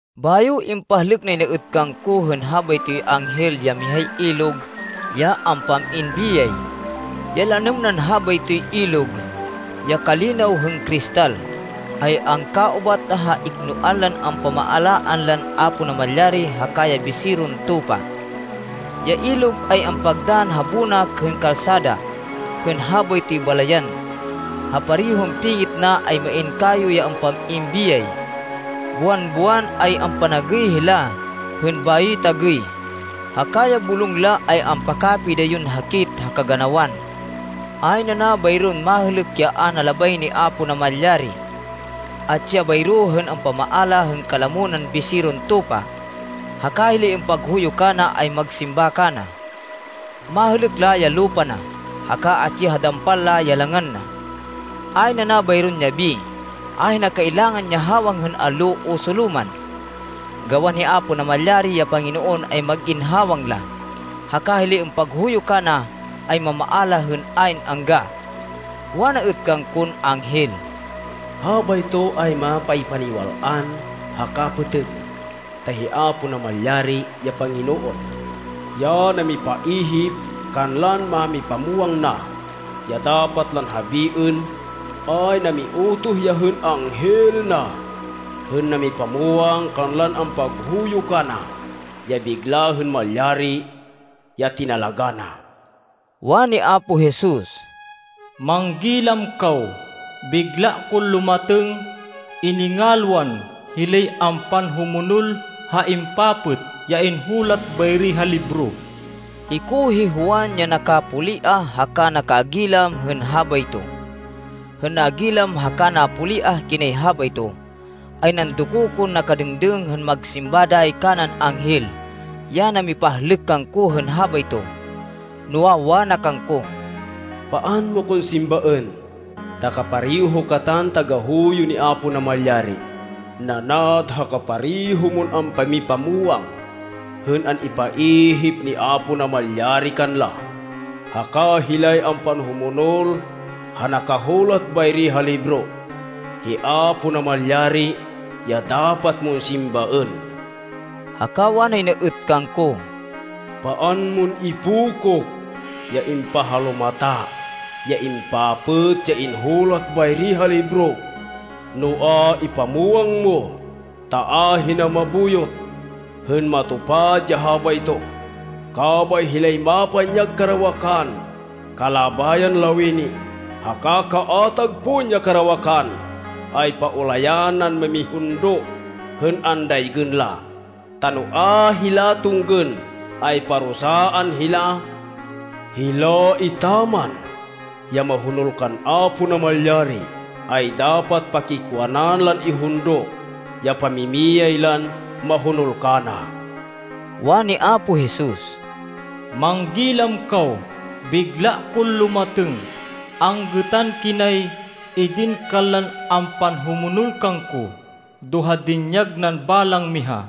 Bayo impahlêk nay na êt kangko hên habaytoy anghel ya mihay ilog ya ampam-in biyay. Ya lanêm nan habaytoy ilog, ya kalinaw hên kristal, ay angkaubat ha iknoan lan ampamaalaan lan Apo Namalyari haka ya Biseron Tupa. Ya ilog ay ampagdann ha bonak hên kalsada hên habaytoy balayan. Ha parehon pingit na ay main kayo ya ampam-in biyay. Buwan-buwan, ay ampanagêy hila hên bayoy tagêy, haka ya bulong la ay ampakapidayon hakit ha kaganawan. Ayn ana bayron mahêlêk ya a na labay ni Apo Namalyari. Atsi ya bayro hên ampamaala hên kalamo nan Biseron Tupa. Haka hilay ampaghuyo kana, ay magsimba kana. Mahêlêk la ya lupa na, haka atsi ha dampal la, ya langan na. Ayn ana bayron yabi. Ahina kailangan ya hawang hên allo o solo man, gawan hi Apo Namalyari, ya Panginoon, ay mag-in hawang la, haka hilay ampaghuyo kana, ay mamaala hên ayn angga. Wana êt kangkon anghel, “Habayto ay mapaypaniwal-an haka pêtêg. Ta hi Apo Namalyari, ya Panginoon, ya namipaihip kanlan mámipamwang na, ya dapat lan habiên, ay namiutoh ya hên anghel na hên namipamwang kanlan ampaghuyo kana, ya bigla hên malyari, ya tinalagá na.” Wani Apo Jesus, “Manggilam kaw! Bigla kon lumatêng! Iningalwan hilay ampanhumonol ha impapêt ya inhulat bayri ha libro.” Hiko hi Juan, ya nakapoliah haka nakagilam hên habayto. Hên nagilam haka napoliah kinay habayto, ay nandoko kon nakadêngdêng hên magsimba dayi kanan anghel ya namipahlêk kangko hên habayto, noa, wana kangko, “Paan mo kon simbaên, ta kapareho katan tagahuyo ni Apo Namalyari, nanad ha kapareho mon ampamipamwang hên an-ipaihip ni Apo Namalyari kanla, haka hilay ampanhumonol ha nakahulat bayri ha libro. Hi Apo Namalyari ya dapat mon simbaên!” Haka wanay na êt kangko, “Paan mon ipokok ya impahalumata, ya impapêt, ya inhulat bayri ha libro, noa, ipamwang mo, ta ahina mabuyot, hên matupad ya habayto. Kabay, hilay mapanyag karawakan kalabayan lawini, haka kaatag pon ya karawakan, ay paulayan nan mamihundo hên andaygên la, ta no a hila tunggên, ay parusaan hila. Hila etaman ya mahonol kan Apo Namalyari, ay dapat pakikwanan lan ihundo ya pamimiyay lan mahonol kana.” Wani Apo Jesus, “Manggilam kaw! Bigla kon lumatêng! Anggêtan kinay idin kanlan ampanhumonol kangko do ha dinyag nan balang miha.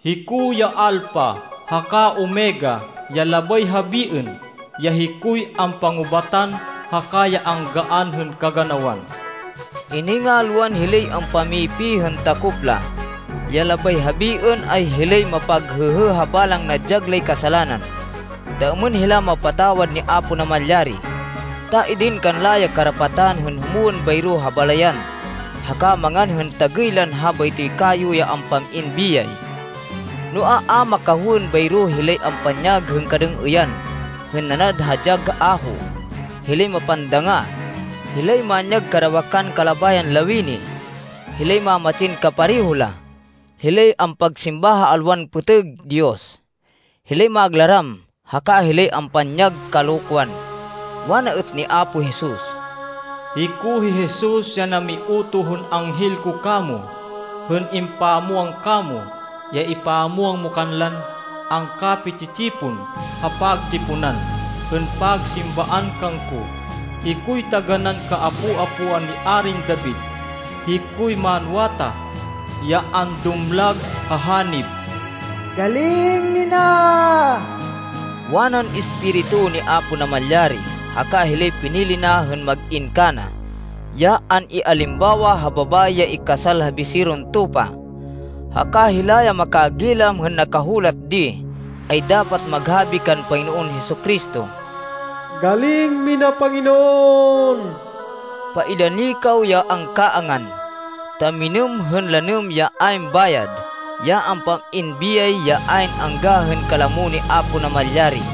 Hiko ya Alpha haka Omega, ya labay habiên, ya hikoy ampangubatan haka ya anggaan hên kaganawan.” Iningalwan hilay ampamipi hên takop la, ya labay habiên, ay hilay mapaghêhê ha balang nadyag lay kasalanan, ta êmên hila mapatawad ni Apo Namalyari, ta idin kanla ya karapatan hên humwên bayro ha balayan, haka mangan hên tagêy lan habaytoy kayo ya ampam-in biyay. Noa, a makahowên bayro hilay ampanyag hên kadêng-êyan hên nanad ha dyag aho, hilay mapandanga, hilay manyag karawakan kalabayan lawini, hilay mamatsin kapareho la, hilay ampagsimba ha alwan pêtêg diyos, hilay maglaram haka hilay ampanyag kalokwan. Wana êt ni Apo Jesus, “Hiko hi Jesus ya namiutoh hên anghel ko kamo hên impamwang kamo, ya ipamwang mo kanlan angkapi-tsi-tsipon ha pagtsiponan hên pagsimbaan kangko. Hikoy taganán kaapo-apoan ni Arin David, hikoy manwatah, ya andumlag ha hanib.” “Galing mina!” wanan Espiritu ni Apo Namalyari haka hilay pinili na hên mag-in kana, ya an-ialimbawa ha babayi ya ikasal ha Biseron Tupa. Haka hila ya makagilam hên nakahulat di ay dapat maghabi kan Panginoon Jesu-Cristo, “Galing mina Panginoon!” Paidani kaw ya angkaangan, ta minêm hên lanêm ya ayn bayad, ya ampam-in biyay ya ayn angga hên kalamo ni Apo Namalyari.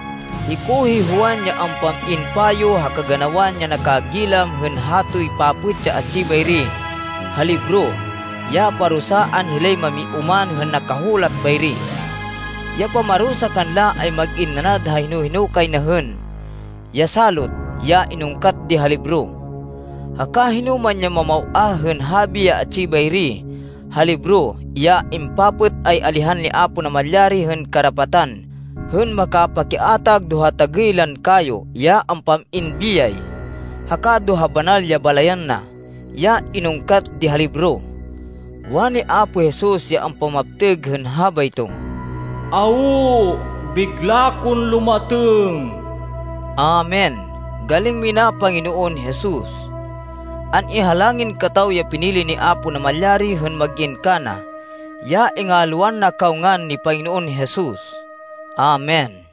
Hiko hi Juan ya ampam-in payo ha kaganawan ya nakagilam hên hatoy papêt ya atsi bayri ha libro, ya parusaan hilay mamioman hên nakahulat bayri. Ya pamarusa kanla ay mag-in nanad ha hino-hino kay na hên ya salot ya inungkat di ha libro. Haka hinoman ya mamaw-ah hên habi ya atsi bayri ha libro, ya impapêt, ay alihan ni Apo Namalyari hên karapatan hên makapakiatag do ha tagêy lan kayo ya ampam-in biyay, haka do ha banal ya balayan na, ya inungkat di ha libro. Wani Apo Jesus ya ampamaptêg hên habayto, “Awo, bigla kon lumatêng!” Amen! Galing mina, Panginoon Jesus! An-ihalangin kataw ya pinili ni Apo Namalyari hên mag-in kana, ya ingalwan na kaw ngan ni Panginoon Jesus. Amen.